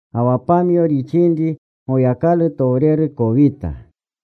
Ga wa pamyo rixinri Goyakalutowreru kowita.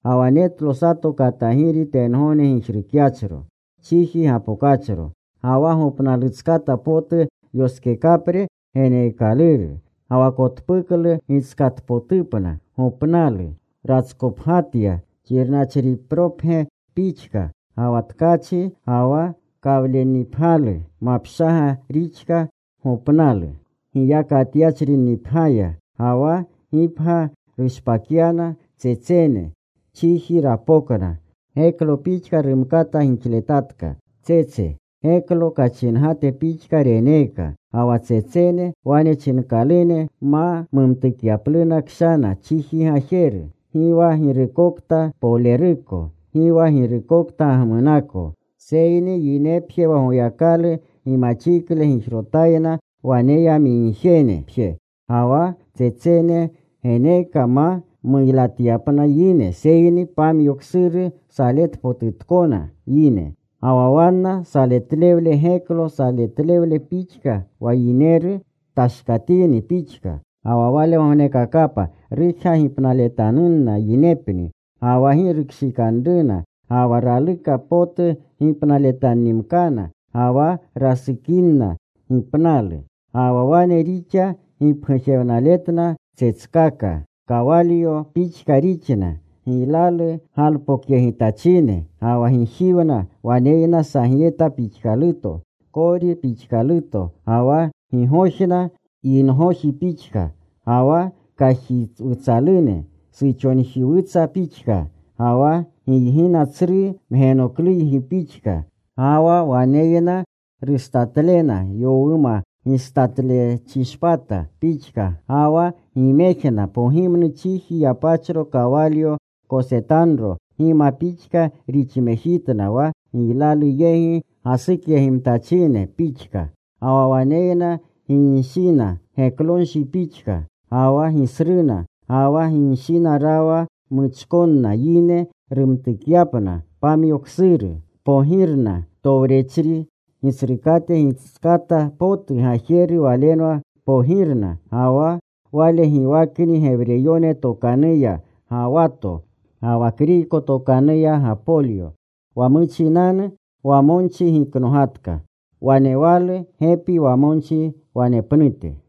Ga wa netlo sato katagiri tengogne gijrukyachro. Chiji gapokachro. Ga wa gopnalutskata potu yoskekapre geneekaluru. Ga wa kotpuklu gitskatpotupna. Gopnalu ratskopgyatya, xirnachripropgya pixka. Ga wa tkachi ga wa kawlennipgyalu mapshaga rixka gopnalu giyakatyachrinnipgyaya. Ga wa gipgya rushpakyana tsetsene. Chiji rapokna. Geklo pixka rumkata gixletatka tsetse. Geklo kachingate pixka reneeka. Ga wa tsetsene wane chinkalune ma mumtukyapluna kshana chiji gajeru, gi wa girukokta poleruko, gi wa girukokta gagmunako, seyni yinepje wa Goyakalu gimaxikle gijrotayna waneyamigjenepje. Ga wa tsetsene geneeka ma muylatyapna yine seyni pamyo ksuru saletpotutkona yine. Ga wa wanna saletlewle geklo saletlewle pixka wa yineru tashkatini pixka. Ga wa walegognekakapa rujga gipnaletanunna yinepni, ga wa gi rukshikanruna. Ga wa raluka potu gipnaletannimkana. Ga wa rasukininna gipnalu. Ga wa wane rixa gipgujewnaletna tsetskaka. Kawalyo pixka rixna, giylalu galpokyegitachine. Ga wa gijiwna waneyna sagyeta pixkaluto, kori pixkaluto. Ga wa gigojna yingoji pixka. Ga wa kajiwutsalune suxojiwutsa pixka. Ga wa giygina tsru mgenokluygi pixka. Ga wa waneyna rustatlena yowuma gistatlechishpata pixka. Ga wa gimejna pogimnu chiji yapachro kawalyo kosetanro gima pixka rixmejitna wa giylalu yegi gasukyegimtachine pixka. Ga wa waneyna ginshina, geklonshi pixka, ga wa gisruna. Ga wa ginshina rawa muchkonna yine rumtukyapna pamyo ksuru. Kpogirna. Towrechri gitsrukate gitskata potu gajeru walenwa pogirna. Ga wa wale giwakni Gewreyone tokanuya Gawato. Ga wa Kriyko tokanuya Gapolyo. Wa muchinanu wamonchi giknogatka. Wanewalu gepi wamonchi wanepnute.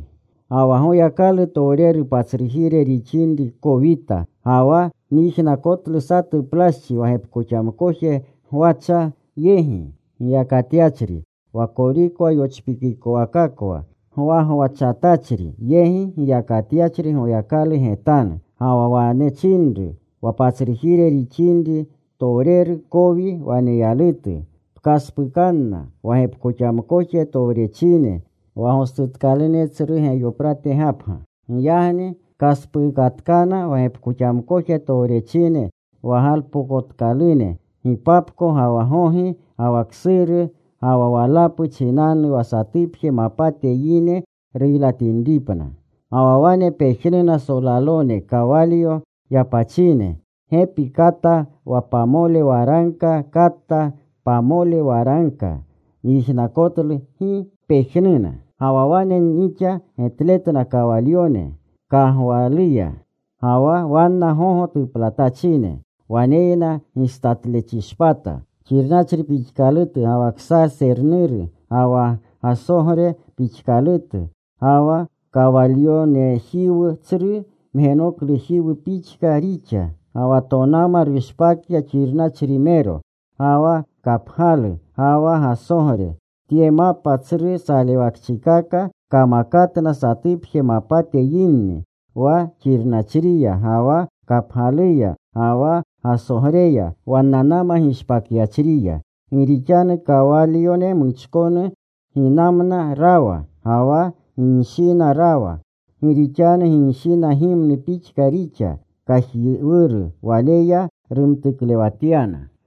Ga wa Goyakalutowreru patsrujire rixinri kowita. Ga wa nyijnakotlu satu plaschi wa gepkoxamkoje gwacha yegi giyakatyachri, wa korikwa yopchikikowakakwa gwagwachatachri yegi giyakatyachri Goyakalu getanu. Ga wa wane chinru wa patsrujire rixinri gitowreru kowi waneyalutu, “Pkaspukanna wa gepkoxamkoje towrechine wa gostukalune tsru Geyoprate Gapga.” Giyagni kaspuukatkana wa gepkoxamkoje towrechine wa galpokotkalune gipapko ga wa gogi ga wa ksuru ga wa walapu chinanu wa satupje mapate yine ruylatinripna. Ga wa wane pejnuna solalone kawalyo yapachine: Gepi kata wa pamole waragka kata pamole waragka. Nyijnakotlu gi pejnuna. Ga wa wane nixa getletna kawalyone kaygawluya, ga wa wanna gogo tuplatachine. Waneyna gistatlechishpata xirnachri pixkalutu ga wa ksajsernuru ga wa gasogre pixkalutu. Ga wa kawalyonejiwu tsru mgenoklujiwu pixka rixa. Ga wa tonama rushpakya xirnachrimero ga wa kapgyalu ga wa gasogre. Tye mapa tsru salewakchikaka kamakatna satupje mapate yinni. Wa xirnachriya ga wa kapgyaluya, ga wa gasogreya, wannanama gishpakyachriya. Gi rixanu kawalyone muchkonu ginamna rawa, ga wa ginshina rawa. Gi rixanu ginshina gimnu pixka rixa kajiwuru. Waleya rumtuklewatyana.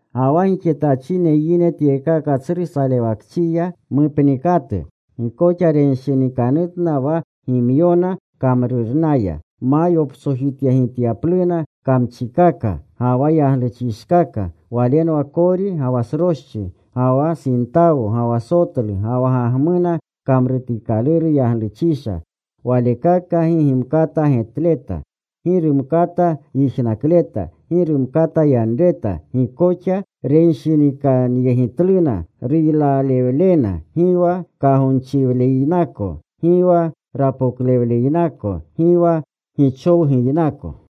Ga wa gixetachine yine tyekaka tsru salewakchiya mupnikatu, gi koxa renshinikanutna wa gimyona kamrurnaya, ma yoptsojityegityanupluna kamchikaka ga wa yagluchishkaka. Walenwa kori ga wa sroschi, ga wa sintawo, ga wa sotlu, ga wa gagmuna kamrutikaluru yagluchisha. Walekaka gi gimkata getleta. Gi rumkata yijnakleta. Gi rumkata yanreta. Gi koxa renshinikanyegitluna ruylalewlena, gi wa kagonchiwleynako, gi wa rapoklewleynako, gi wa gichowguynako.